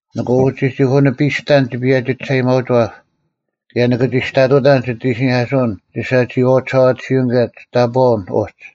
ᓂᑭ ᐅᒋᒋᐧᑯᓂᐱᔅᑕᓐ ᒋ ᐸᔭᒋ ᒋᓴᐊᔭᒥᐊᐅᒋᐛᑉ, ᑭᔭ ᓂᑭ ᒋᔅᑕᑐᑕᓐ ᒋᑦ ᐃᓯᓂᐧᑲᓱᐅᓐ ᒋ ᓴᒋᐃᐛᐤ ᒋᓴᐛᑎᓯᐅᓐ ᑭᔭ ᒋᑕᑈᐅᓐ ᐅᒡ: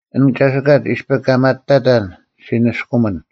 ᐊᓐ ᒐᓯᑲᒡ ᐃᔅᐱ ᑲ ᒪᑕᑕᓐ ᔅᒋ ᓂᔅᑯᒥᓐ,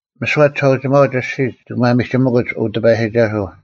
ᒥᓯᐛ ᒋᓴᐅᒋᒪᐅᒡ ᐊᔅᒋᒡ ᒋᑭ ᒪᒥᒋᒥᑯᒡ, ᐅ ᑎᐸᔨᒋᒐᓱᐤ,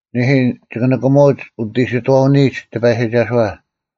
ᓂᐦᐃ, ᒋᑭ ᓂᑭᒧᐅᒡ ᐅᑦ ᐃᓯᑥᐅᓂᔨᒡ ᑎᐸᔨᒋᒐᓱᐛ: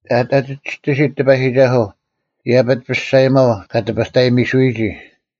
ᐊᑎ ᐊ ᒋᔅᑎᓯᑦ ᑎᐸᔨᒋᒐᓱᐤ, ᐃᔭᐱᒡ ᐱᔅᒐᔨᒪᐤ ᑲ ᑎᐱᑕᔨᒥᓱᔨᒋ: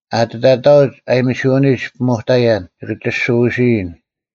ᐊᑎ ᑕᑕᐅᒡ ᐊᔨᒥᓯᐅᓂᒡ ᐱᒧᑕᔭᓐ, ᒋᑭ ᒋᓯᐎᓯᔨᓐ: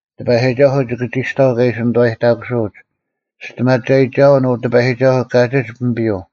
ᑎᐸᔨᒋᒐᓱᐤ ᒋᑭ ᒋᔅᑕᐤ ᑲ ᐃᓯ ᓂᑐᐛᔨᑕᑯᓱᐅᒡ: ᒋᔅᑎᒪᒐᔨᒋᒐᐅᓐ, ᐅ ᑎᐸᔨᒋᒐᓱᐤ ᑲᒋᒡ ᐱᒥᐱᔪᐤ: